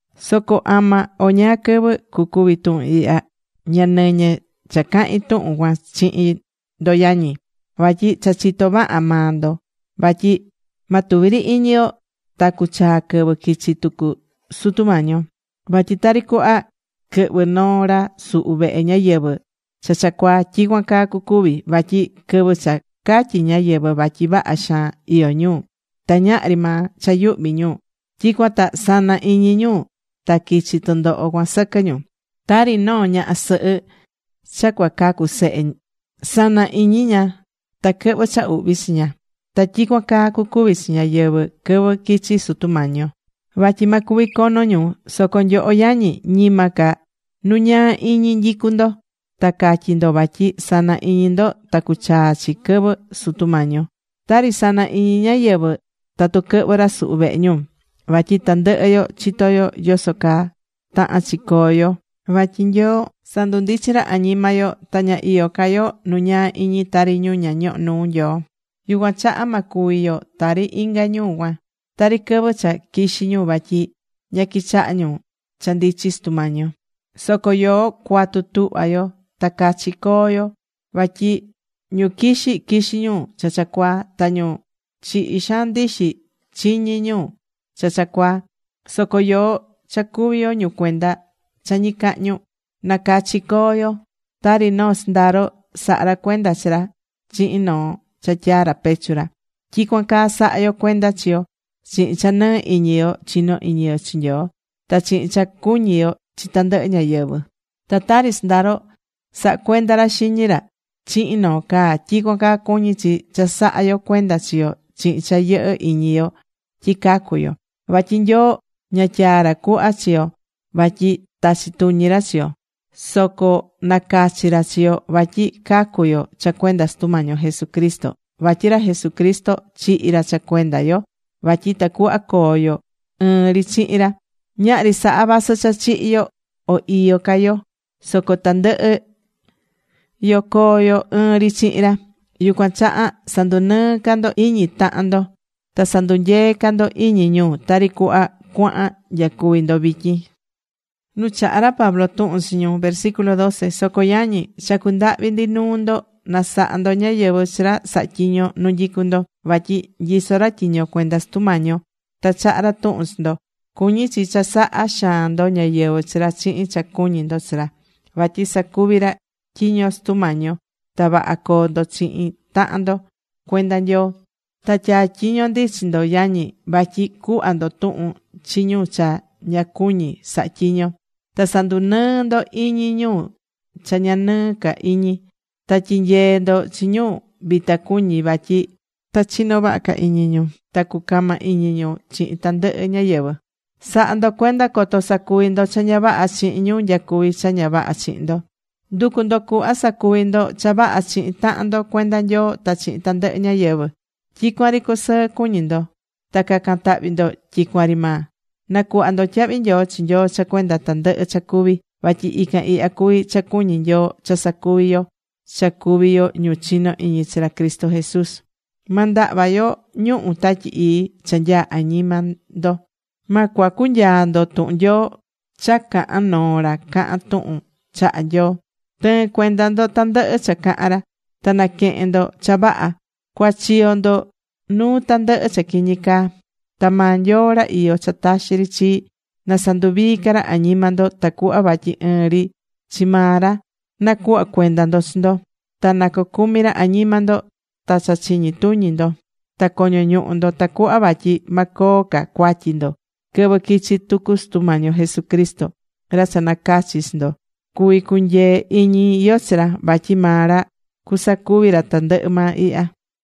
Soco ama o ñáá quɨvɨ cucuvi tuhun ihya, ña nɨñɨ cha cahin tuhun cuan chihin ndo yañi. Vatyi cha chitó vaha maa ndo vatyi ma tuvi ri iñi yo ta cuchaa quɨvɨ quichi tucu Sutu Mañi yo. Vatyi tari cuhva quɨhvɨ noo ra suhu vehe ñáyɨvɨ cha cha cuaa, tyicuan caa cucuvi. Vatyi quɨvɨ cha catyí ñáyɨvɨ vatyi vaha xaan iyó ñu, ta ñahri maa cha yuhvi ñu, tyicuan ta sana iñi ñu ta quichi tɨndoho cuan sɨquɨ ñu. Tari noo ñaha sɨhɨ cha cuacacu sehe, sana iñi ña ta quɨhvɨ cha uhvi chi ña. Ta tyicuan caa cucuvi chi ñáyɨvɨ quɨvɨ quichi Sutu Mañi yo, vatyi ma cuvi cono ñu. Soco nyoho yañi, ñima ca nu ñaa iñi nyicú ndo ta catyi ndo vatyi sana iñi ndo ta cuchaa chi quɨvɨ Sutu Mañi yo, tari sana iñi ñáyɨvɨ tatu quɨhvɨ ra suhu vehe ñu. Vatyi tandɨhɨ yo chitó yo yoso caa tahán chi coo yo vatyi Nyoo sandundichin ra añima yo, ta ña iyó ca yo nu ñaa iñi tari ñu ña ñohó nuu Nyoo. Yucuan chaha ma cuvi yo tari inga ñu cuan. Tari quɨvɨ cha quixí ñu vatyi ña quichahá ñu cha ndichi Sutu Mañi yo. Soco yoó cua̱tu tuhva yo ta cachi co̱o yo. Vatyi ñu quixí, quixí ñu cha cha cuaa, ta ñu chihi xaan ndixi, chiñí ñu cha cha cuaa. Soco yoó cha cuví yo ñu cuenda cha ñicahñu, nacachi co̱o yo. Ta tari noo sɨndaro sahá ra cuenda chi ra chihin noo cha tyaá ra pechu ra, tyicuan caa sa̱ha yo cuenda chi yo chihin cha nɨɨ iñi yo chinó iñi yo chi Nyoo, ta chihin cha cuñí yo chi tandɨhɨ ñáyɨvɨ. Ta tari sɨndaro sahá cuenda ra xiñi ra chihin noo caa, tyicuan caa cuñí chi cha sahá yo cuenda chi yo chihin cha yɨhɨ́ iñi yo tyi cacu̱ yo. Vatyi Nyoo ña tyaa̱ ra cuhva chi yo vatyi tachi tuñi ra chi yo, soco nacachi̱ ra chi yo vatyi cacu yo cha cuenda Sutu Mañi yo Jesucristo. Vatyi ra Jesucristo chihi̱ ra cha cuenda yo vatyi tacuhva coo yo ɨɨn ri chihin ra. Ñahri saha vasɨ cha chihi̱ yo o iyó ca yo, soco tandɨhɨ yo coo yo ɨɨn ri chihin ra. Yucuan chaha sa̱ndunɨɨ ca ndo iñi tahan ndo ta sa̱ndunyee ca ndo iñi ñu, tari cuhva cuahan nyacuví ndo vityin. Nu chaha̱ ra Pablo tuhun chi ñu Soco yañi, chacú ndahvi ndi nuu ndo, na saha ndo ñáyɨvɨ chi ra sahá tyiño nu nyicú ndo. Vatyi nyisó ra tyiño cuenda Sutu Mañi yo ta chahá ra tuhun chi ndo. Cuñí chi cha saha xaan ndo ñáyɨvɨ chi ra chihin cha cuñí ndo chi ra. Vatyi sacuví ra tyiño Sutu Mañi yo. Ta vaha co̱o ndo chihin tahan ndo cuenda Nyoo. Ta tyatyiñó ndi chi ndo yañi, vatyi cu̱hva ndo tuhun chi ñu cha ña cuñí saha tyiño. Ta sa̱ndunɨɨ ndo iñi ñu cha ña nɨɨ ca iñi. Ta tyi̱nyee ndo chi ñu vita cuñí vatyi ta chino vaha ca iñi ñu. Ta cu̱cama iñi ndo chihin tandɨhɨ ñáyɨvɨ. Sa̱ha ndo cuenda coto sacuvi ndo cha ña vaha chihin ñu nyacuví cha ña vaha chihin ndo. Ndu̱cu ndo cuhva sacuvi ndo cha vaha chihin tahan ndo cuenda Nyoo ta chihin tandɨhɨ ñáyɨvɨ. Tyicuan ri cu̱sɨɨ cuñi ndo. Ta ca̱can tahvi ndo tyicuan ri maa. Na̱cuhva ndo tyahvi nyoo chi Nyoo cha cuenda tandɨhɨ cha cuví. Vatyi ican ihya cuví cha cuñí Nyoo cha sacuvi yo cha cuví yo ñu chinó iñi chi ra Cristo Jesús. Ma ndahva ndo ñuhu̱ Tatyi Ii cha nyaá añima ndo. Ma cuacu nyaa ndo tuhun Nyoo cha cahán noo ra cahán tuhun chahá Nyoo. Tɨ̱ɨn cuenda ndo tandɨhɨ cha cahán ra. Ta na̱quehen ndo cha vaha. Cua̱chiyo ndo nuu tandɨhɨ cha quiñi caa. Ta maa Nyoo ra iyó cha taxi ri chii, na sanduvii ca ra añima ndo tacuhva vatyi ɨɨn ri chi maa ra nacuhva cuenda ndo chi ndo. Ta na cocumi ra añima ndo ta cha chiñi tuñi ndo ta coño ñuhu ndo tacuhva vatyi ma coo ca cuatyi ndo quɨvɨ quichi tucu Sutu Mañi yo Jesucristo. Ra cha nacachi̱ chi ndo, cuví cunyee iñi yo chi ra, vatyi maa ra cusacuvi ra tandɨhɨ maa ihya.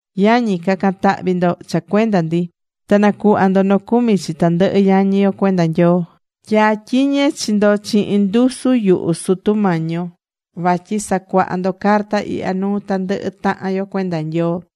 Yañi, ca̱can tahvi ndo cha cuenda ndi. Ta na̱cuhva ndo nocumi chi tandɨhɨ yañi yo cuenda Nyoo. Tyatyiñé chi ndo chihin ndusu yuhu Sutu Mañi yo vatyi sa̱cuaha ndo carta ihya nuu tandɨhɨ tahan yo cuenda Nyoo.